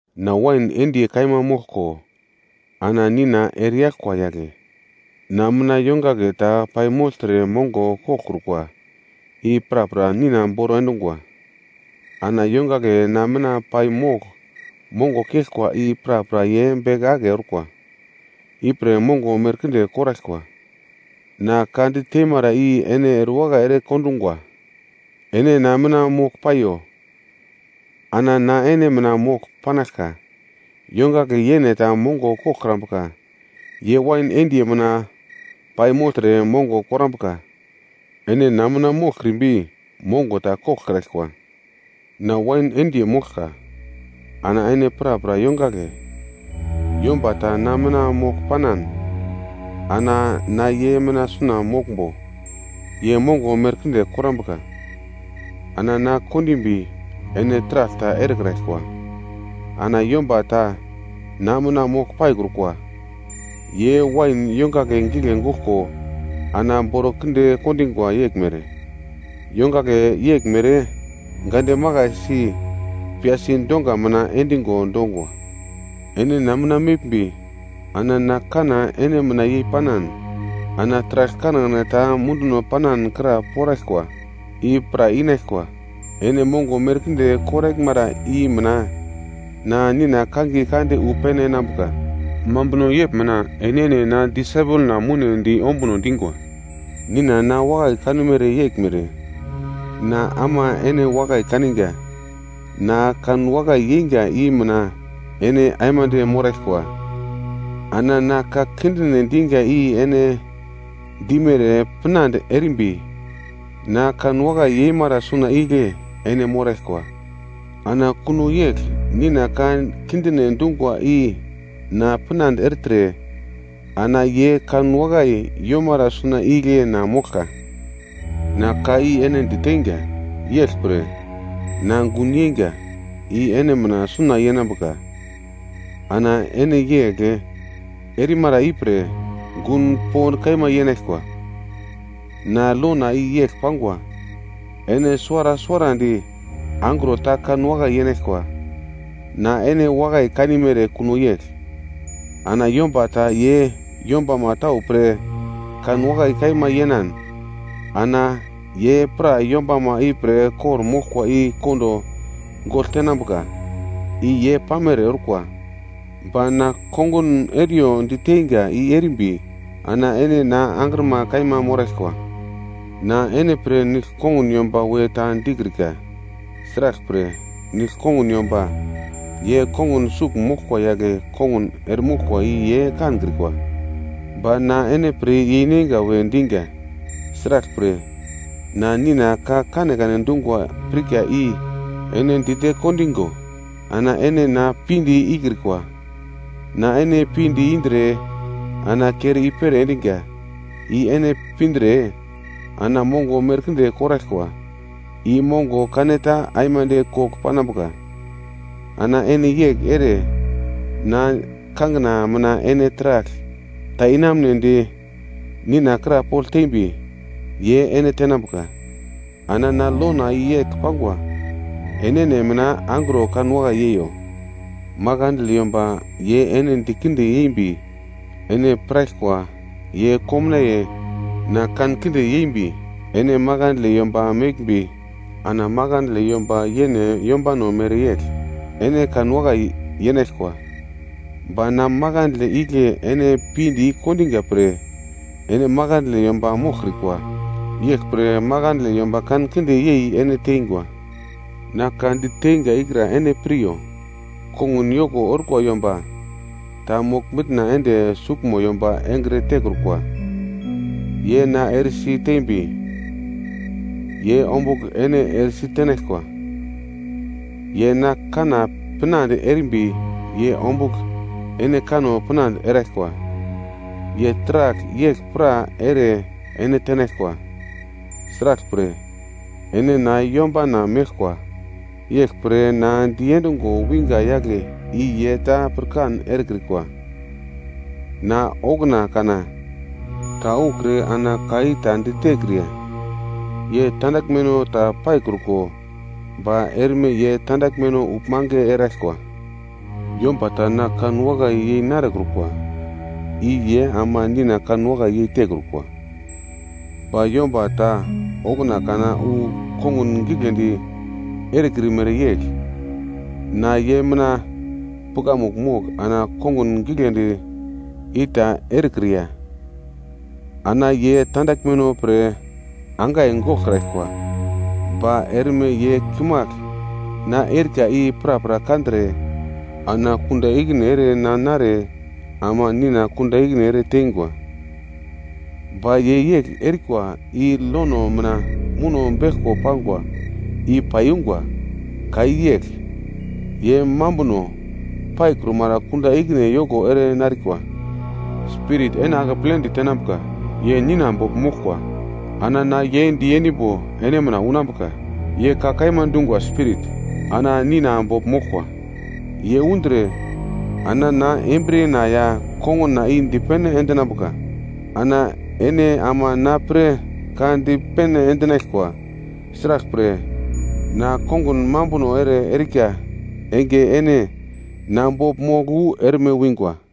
“Na wain endiye kaima moglko, ana Nina ereyaglkwa yagle. Na mina yongagle ta paimogltre mongo koglkrukwa i prapra Nina boro endungwa. Ana yongagle na mina pai mogl mongo keglkwa i prapra ye beke ake orkwa, ipre mongo merkinde koraglkwa. Na ka di teimara i ene erewakai ere kondungwa. Ene na mina mogl paiyo, ana na ene mina mogl panaglka. Yongagle yene ta mongo koglkrambuka, ye wain endiye mina pai mogltre mongo korambuka. Ene na mina moglkrimbi mongo ta koglkraglkwa. “Na wain endiye moglka, ana ene prapra yongagle, yomba ta na mina mogl panan, ana na ye mina suna moglmbo, ye mongo merkinde korambuka, ana na kondimbi ene taragl ta erekraglkwa. Ana yomba ta na mina mogl paikrukwa, ye wain yongagle gigle goglko ana boro kinde kondingwa yeglmere. Yongagle yeglmere gande makaisi piyasi donga mina endingo dongwa. Ene na mina meglmbi, ana na kanna ene mina yei panan, ana taragl kanekane ta munduno panan kra poraglkwa, i pra inaglkwa. Ene mongo merkinde koraglmara i mina na Nina kangiye kande wu pene enambuka, mambuno yegl mina enene na disaipelna mounedi ombuno dingwa. “Nina na wakai kanumere yeglmere, na ama ene wakai kaninga. Na kanwakai yeinga i mina ene aimande moraglkwa. Ana na ka kindine dinga i ene dimere pinande erimbi, na kanwakai yeimara suna igle ene moraglkwa. Ana kuno yegl Nina ka kindine dungwa i na pinande ertre, ana ye kanwakai yomara suna igle na moglka. Na ka i ene diteinga, yeglpre na gun yeinga i ene mina suna yenambuka, ana ene yegl erimara ipre, gun pond kaima yenaglkwa. Na lona i yegl pangwa, ene suwara suwarandi angro ta kan wakai yenaglkwa. Na ene wakai kanimere kuno yegl. Ana yomba ta ye yombama tau pre kan wakai kaima yeinan, ana ye pra yombama ipre kor-moglkwa i kondo gogl tenambuka. I ye pamere orkwa. Ba na kongun eriyo diteinga i erimbi, ana ene na angrima kaima moraglkwa. Na ene pre nigl-kongun yomba we ta dikrika, sraglpre nigl-kongun yomba ye kongun sugl moglkwa yagle kongun eremoglkwa i ye kankrikwa. Ba na ene pre yeineinga we dinga, sraglpre, na Nina ka kanekane dungwa pirka i ene dite kondingo. Ana ene na pinde ikrikwa, na ene pinde indre ana kere i-pere endinga i ene pindre ana mongo merkinde koraglkwa, i mongo kaneta aimande kogl panambuka. Ana ene yegl ere na kangina mina ene taragl ta inamunedi Nina krapogl tembi, ye ene tenambuka. Ana na lona i yegl pangwa, enene mina angro kanwakai yeiyo. “Makandle yomba ye ene dikinde yembi, ene piraglkwa ye komnaiye na kankinde yembi ene makandle yomba meglmbi, ana makandle yomba yene yombano mereyegl ene kanwakai yenaglkwa. Ba na makandle igle ene pinde i-kondinga pre ene makandle yomba moglkrikwa. Yeglpre makandle yomba kankinde yei ene teingwa. Na ka diteinga ikra ene piryo: ‘Kongun yoko orkwa yomba ta mogl-mitna ende suglmo yomba engre tekrukwa.’ Ye na eresi tembi, ye ombugl ene eresi tenaglkwa, ye na kanna pinande erimbi ye ombugl ene kanno pinande eraglkwa. Ye taragl yegl pra ere ene tenaglkwa, sraglpre ene na yombana meglkwa, yeglpre na diendungo wingwa yagle i ye ta pirkan erekrikwa. Na okuna kana ta ukre ana ka i ta ditekriya ye tandaglmeno ta paikruko. Ba erme ye tandaglmeno uglmange erekraglkwa. Yomba ta na kanwakai yei narekrukwa i ye ama Nina kanwakai yeitekrukwa. Ba yomba ta okuna kana wu kongun giglendi erekrimere yegl na ye mina pukamugl mogl ana kongun giglendi i ta erekriya, ana ye tandaglmeno pre angai goglkraglkwa. Ba erme ye kimagl na erika i prapra kandre ana kunda ikine ere na nare ama Nina kunda ikine ere teingwa. Ba ye yegl erikwa i lono mina muno beglko pangwa i paiyungwa. Ka i yegl, ‘Ye mambuno paikrumara kunda ikine yoko ere narikwa.’ “Spirit ene akepledi tenambuka, ye Nina bogl moglkwa ana na ye diendimbo ene mina unambuka. Ye ka kaima dungwa Spirit, ana Nina bogl moglkwa. Ye undre ana na embriyena ya konguna i dipene endinambuka. Ana ene ama na pre ka dipene endinaglkwa. Sraglpre, na kongun mambuno ere erika enge ene na bogl mogl wu erme wingwa.